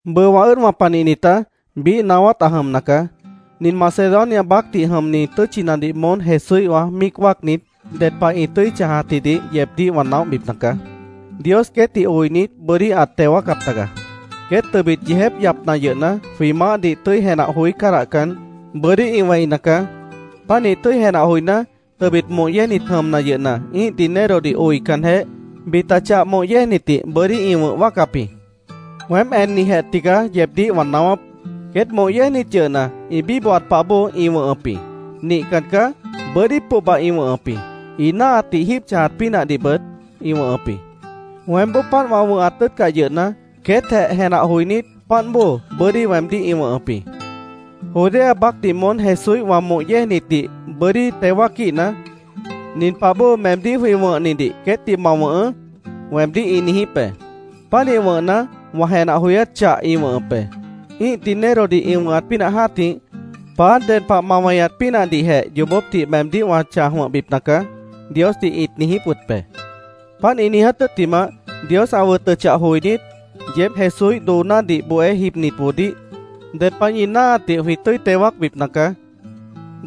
Bʉʉ wã ʉ́ʉdwã panihnitá, biíh naáwát ã jʉmna caá. Nin Macedonia baácdih jʉmni tʉ́tchinadih moón Jesúíhwã míic wáacnit ded pah ĩ tʉ́i chãjatjidih yeebdíh wã naóhbipna caá. Dios queétdih oinit, bʉ́dí ãt teo wáacap taga. Queét tʉbit yeejép yapna yʉhna, jwĩ Maáhdih tʉ́i jenah joí cádahcan, bʉ́dí ĩ wẽina caá. Pánih tʉ́i jenah joiná, tʉbit moh yéejnit jʉmna yʉhna, ĩ́ih dinerodih oicanjeh, bita chah moh yéejnitdih bʉ́dí ĩ wʉ̃h wáacap jĩ. Weém ennijijeh tigaá yeebdíh wã naáwáp. Queét moh yéejnit yʉhna, ĩ bíbohat pah bóo ĩ wʉ̃hʉp jĩ. Nihcan caá. Bʉ́dí pohba ĩ wʉ̃hʉp jĩ. Ĩ náahatdih jíib chãjat pínahdihbʉt ĩ wʉ̃hʉp jĩ. Weémboó páant wã wʉ̃hat tʉ́ʉtcah yʉhna, queétjeh jenah joinít, páant bóo bʉ́dí weemdíh ĩ wʉ̃hʉp jĩ. “Judea baácdih moón Jesúíhwã moh yéejnitdih bʉ́dí teo wáaquíhna, nin pah bóo meemdíh jwĩ wʉ̃hnidih queétdih ma wʉ̃hʉʉ́”, weemdíh ĩ niijíp be. Pánih wʉ̃hna, wã jenah joyát chah ĩ wʉ̃hʉp be. Ĩ́ih dinerodih ĩ wʉ̃hat pínah jã́tih, “Paá, ded pah ma weñat pínahdihjeh yoobópdih meemdíh wã chãj wʉ̃hbipna caá”, Diosdih ĩt niijíp wʉt be. Páant ĩ niiját tʉ́ttimah, “Dios ã wʉtʉchah joinít, yeéb Jesúíh doonádih bohé jibnitboodíh ded pah ñi náahatdih jwĩ tʉ́i teo wáacbipna caá.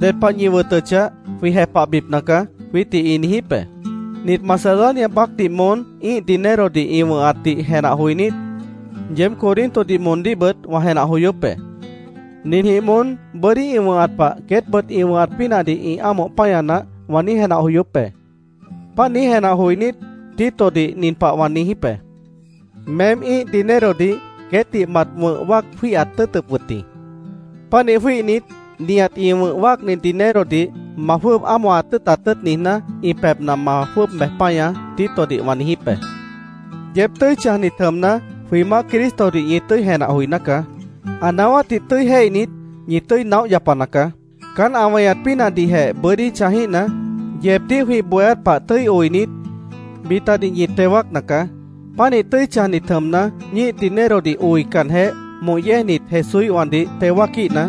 Ded pah ñi wʉtʉchah, jwĩ jepahbipna caá”, jwiítdih ĩ niijíp be. Nit Macedonia baácdih moón ĩ́ih dinerodih ĩ wʉ̃hatdih jenah joinít, yeéb Corintodih moondíhbʉt wã jenah joyóp be. “Ninjĩh moón bʉ́dí ĩ wʉ̃hat pah queétbʉt ĩ wʉ̃hat pínahdih ĩ ámoh páña naáh”, wã niíj jenah joyóp be. Páant niíj jenah joinít, Titodih nin pah wã niijíp be: “Meém ĩ́ih dinerodih queétdih mat wʉ̃h wáac jwíihat tʉ́ʉtʉp wʉt jĩ. Pánih jwíihnit, nihat ĩ wʉ̃h wáacni dinerodih ma jwʉ́ʉb ámohat tʉ́ʉtat tʉ́ʉt niijná, ĩ pebhna ma jwʉ́ʉb bej páñaá”, Titodih wã niijíp be. Yeéb tʉ́i chãjnit jʉmna, jwĩ Maáh Cristodih ñi tʉ́i jenah joiná caá. Ã naáwátdih tʉ́i jéihnit, ñi tʉ́i naóh yapana caá. Caán ã weñat pínahdihjeh bʉ́dí chãjíhna, yeebdíh jwĩ bohéát pah tʉ́i oinit, bitadih ñi teo wáacna caá. Pánih tʉ́i chãjnit jʉmna, ñíih dinerodih oicanjeh, moh yéejnit Jesúíhwãdih teo wáaquíhna,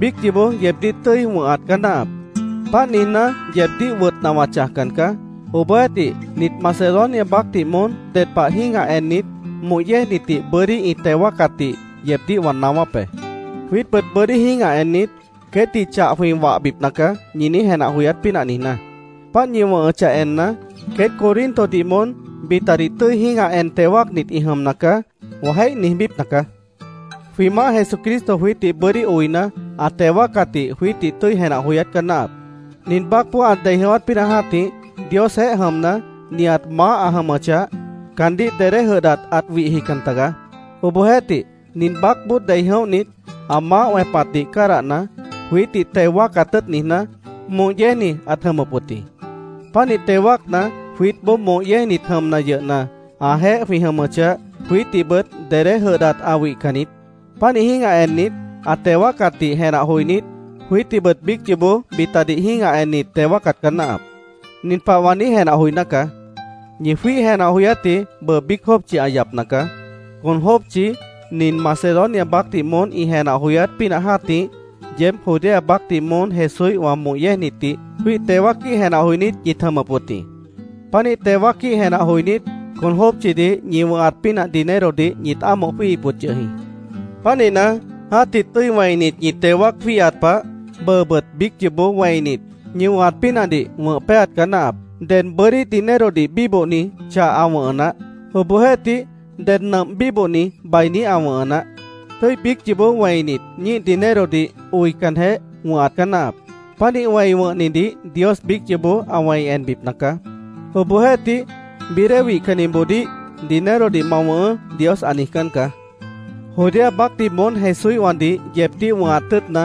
biíc yoobó yeebdíh tʉ́i wʉ̃hat caá náahap. Páant niijná, yeebdíh wʉtna wã chãjcan caá. Obohjeéhtih, nit Macedonia baácdih moón ded pah jĩ́gah ennit, moh yéejnitdih bʉ́dí ĩ teo wáacatdih yeebdíh wã naáwáp be, “Jwiítbʉt bʉ́dí jĩ́gah ennit, queétdih chah jwĩ wahbipna caá”, ñi niíj jenah joyát pínah niijná. Páant ñi wʉ̃hʉchah enna, “Queét Corintodih moón bitadih tʉ́i jĩ́gah en teo wáacnit ĩ jʉmna caá”, wã jéih niijbípna caá. Jwĩ Maáh Jesucristo jwiítdih bʉ́dí oina, ã teo wáacatdih jwiítdih tʉ́i jenah joyát caá náahap. Nin baácboó ã dei jʉ̃ʉ́wát pínah jã́tih, Diosjeéh jʉmna, nihat maáh ã jʉmʉchah, caandíh dedé jʉdhdat ãt wihjican tagaá. Obohjeéhtih, nin baácboó dei jʉ̃óhnit, ã maáh wẽpatdih cádahna, jwiítdih teo wáacat tʉ́ʉt niijná, moh yéejni ãt jʉmʉp wʉt jĩ. Pánih teo wáacna, jwiítboó moh yéejnit jʉmna yʉhna, ãjeéh jwĩ jʉmʉchah, jwiítdihbʉt dedé jʉdhdat ã wihcan niít. Pánih jĩ́gah ennit, ã teo wáacatdih jenah joinít, jwiítdihbʉt biíc yoobó bitadih jĩ́gah ennit, teo wáacat caá náahap. Nin pah wã niíj jenah joiná caá: Ñi jwíih jenah joyátji bʉʉ biíc jópchi ã yapna caá. Con jópchi, nin Macedonia baácdih moón ĩ jenah joyát pínah jã́tih, yeéb Judea baácdih moón Jesúíhwã moh yéejnitdih jwíih teo wáaquíh jenah joinít ñit jʉmʉp wʉt jĩ. Pánih teo wáaquíh jenah joinít, con jópchidih ñi wʉ̃hat pínah dinerodih ñit ámoh jwíihip wʉt yʉh jĩ. Pánihna, jã́tih tʉ́i wẽinit ñi teo wáac jwíihat pah, bʉʉbʉt biíc yoobó wẽinit, ñi wʉ̃hat pínahdih wʉ̃h péaat caá náahap. Ded bʉ́dí dinerodih bíbohni chah ã wʉ̃hʉ naáh. Obohjeéhtih, ded nʉmp bíbohni bainí ã wʉ̃hʉ naáh. Tʉ́i biíc yoobó wẽinit, ñíih dinerodih oicanjeh, wʉ̃hat caá náahap. Pánih wẽi wʉ̃hnidih Dios biíc yoobó ã wẽi enbipna caá. Obohjeéhtih, bií dée wihcanniboodíh “Dinerodih ma wʉ̃hʉʉ́”, Dios ã niijcán caá. Judea baácdih moón Jesúíhwãdih yeebdíh wʉ̃hat tʉ́ʉtna,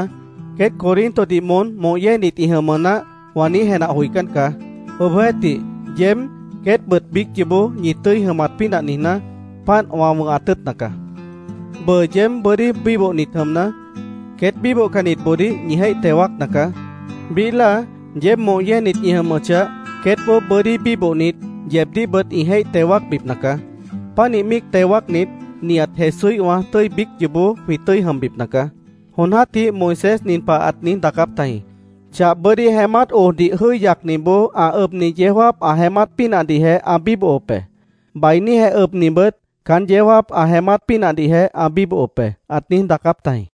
“Queét Corintodih moón moh yéejnit ĩ jʉmʉ naáh”, wã niíj jenah joicán caá. Obohjeéhtih, yeéb, queétbʉt biíc yoobó ñi tʉ́i jʉmat pínah niijná, páant wã wʉ̃hat tʉ́ʉtna caá. Bʉʉ yeéb bʉ́dí bíbohnit jʉmna, queét bíbohcannitboodíh ñi jéih teo wáacna caá. Biíh láa, yeéb moh yéejnit ñi jʉmʉchah, queétboó bʉ́dí bíbohnit, yeebdíhbʉt ĩ jéih teo wáacbipna caá. Pánih míic teo wáacnit, nihat Jesúíhwã tʉ́i biíc yoobó jwĩ tʉ́i jʉmbipna caá. Jon jã́tih Moisés nin pah ãt niíj daacáp tajĩ: “Chah bʉ́dí jeémát ojdih jʉ́i yacniboó ã ʉbni yeó jáap ã jeémát pínahdihjeh ã bíbohop be. Bainíjeh ʉbnibʉt caán yeó jáap ã jeémát pínahdihjeh ã bíbohop be”, ãt niíj daacáp tajĩ.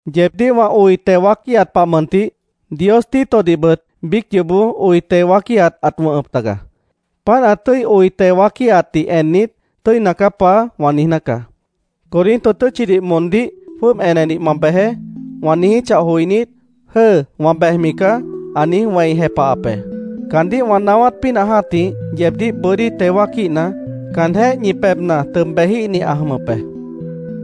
Yeebdíh wã oi teo wáaquíhat pah mʉntih, Dios Titodihbʉt biíc yoobó oi teo wáaquíhat ãt wʉ̃hʉp taga. Páant ã tʉ́i oi teo wáaquíhatdih ennit, “Tʉ́ina caá, Paá”, wã niijná caá. “Corinto tʉ́tchidih moondíh jwʉ́ʉb enedih ma bejeé”, wã niijíchah joinít, “Jʉ́ʉ, wã bejmi caá”, ã niíj wẽi jepahap be. Caandíh wã naáwát pínah jã́tih, yeebdíh bʉ́dí teo wáaquíhna, caanjéh ñi pebhna tʉb bejíhni ã jʉmʉp be.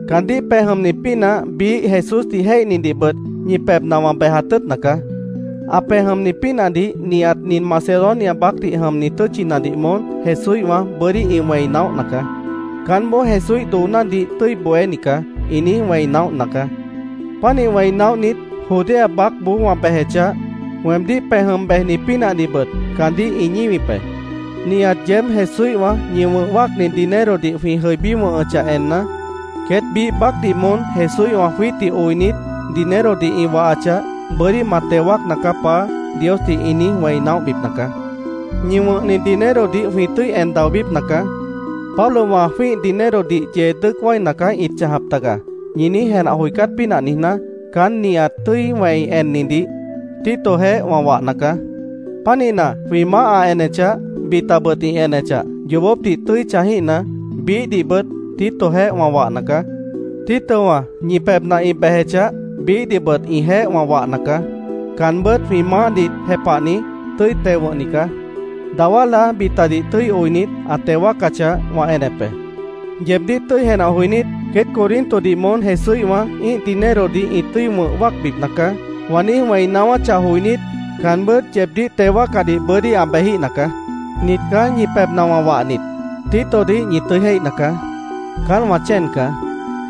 Caandíh pej jʉmni pínah biíh Jesúsdih jéihnidihbʉt ñi pebhna wã bejat tʉ́ʉtna caá. Ã pej jʉmni pínahdih nihat nin Macedonia baácdih jʉmni tʉ́tchinadih moón Jesúíhwã bʉ́dí ĩ wẽi naóhna caá. “Caánboó Jesúíh doonádih tʉ́i bohéni caá”, ĩ niíj wẽi naóhna caá. Pánih wẽi naóhnit, Judea baácboó wã bejechah, weemdíh pej jʉm bejni pínahdihbʉt caandíh ĩ ñíwip be. Nihat yeéb Jesúíhwã ñi wʉ̃h wáacni dinerodih jwĩ jʉibí wʉ̃hʉchah enna, “Queét biíh baácdih moón Jesúíhwã jwiítdih oinit, dinerodih ĩ wahachah, bʉ́dí ma teo wáacna caá, Paá”, Diosdih ĩ niíj wẽi naóhbipna caá. Ñi wʉ̃hni dinerodih jwĩ tʉ́i en daobípna caá. “Pablowã jwĩ́ih dinerodih yee dʉ́ʉc wáina caá ĩt chãjap taga”, ñi niíj jenah joicát pínah niijná, caán nihat tʉ́i wẽi ennidih Titojeéh wã wahna caá. Pánihna, jwĩ Maáh ã enechah, bitabʉt ĩ enechah, yoobópdih tʉ́i chãjíhna, biíhdihbʉt Titojeéh wã wahna caá. Titowã ñi pebhna ĩ bejechah, biíhdihbʉt ĩjeéh wã wahna caá. Caanbʉ́t jwĩ Maáhdih jepahni, tʉ́i teo wʉ̃hni caá. Dawá láa bitadih tʉ́i oinit, ã teo wáacachah, wã enep be. Yeebdíh tʉ́i jenah joinít, “Queét Corintodih moón Jesúíhwã ĩ́ih dinerodih ĩ tʉ́i wʉ̃h wáacbipna caá”, wã niíj wẽi naáwáchah joinít, caanbʉ́t yeebdíh teo wáacadih bʉ́dí ã bejíhna caá. Nit caá ñi pebhna wã wahnit: Titodih ñi tʉ́i jéihna caá. Caán wã chéen caá.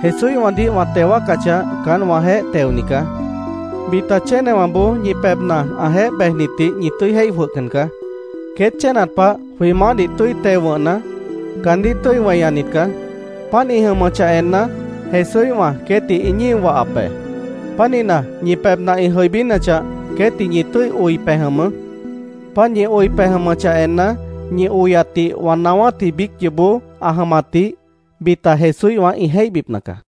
Jesúíhwãdih wã teo wáacachah, caán wãjeéh teoni caá. Bita chénewãboó ñi pebhna ãjeéh bejnitdih ñi tʉ́i jéih jwʉhcan caá. Queét chénat pah jwĩ Maáhdih tʉ́i teo wʉ̃hna, caandíh tʉ́i weñanit caá. Páant ĩ jʉmʉchah enna, Jesúíhwã queétdih ĩ ñío wahap be. Pánihna, ñi pebhna ĩ jʉibínachah, queétdih ñi tʉ́i oi pej jʉmʉʉ́. Páant ñi oi pej jʉmʉchah enna, ñi oyatdih wã naáwátji biíc yoobó ã jʉmatdih bita Jesúíhwã ĩ jéihbipna caá.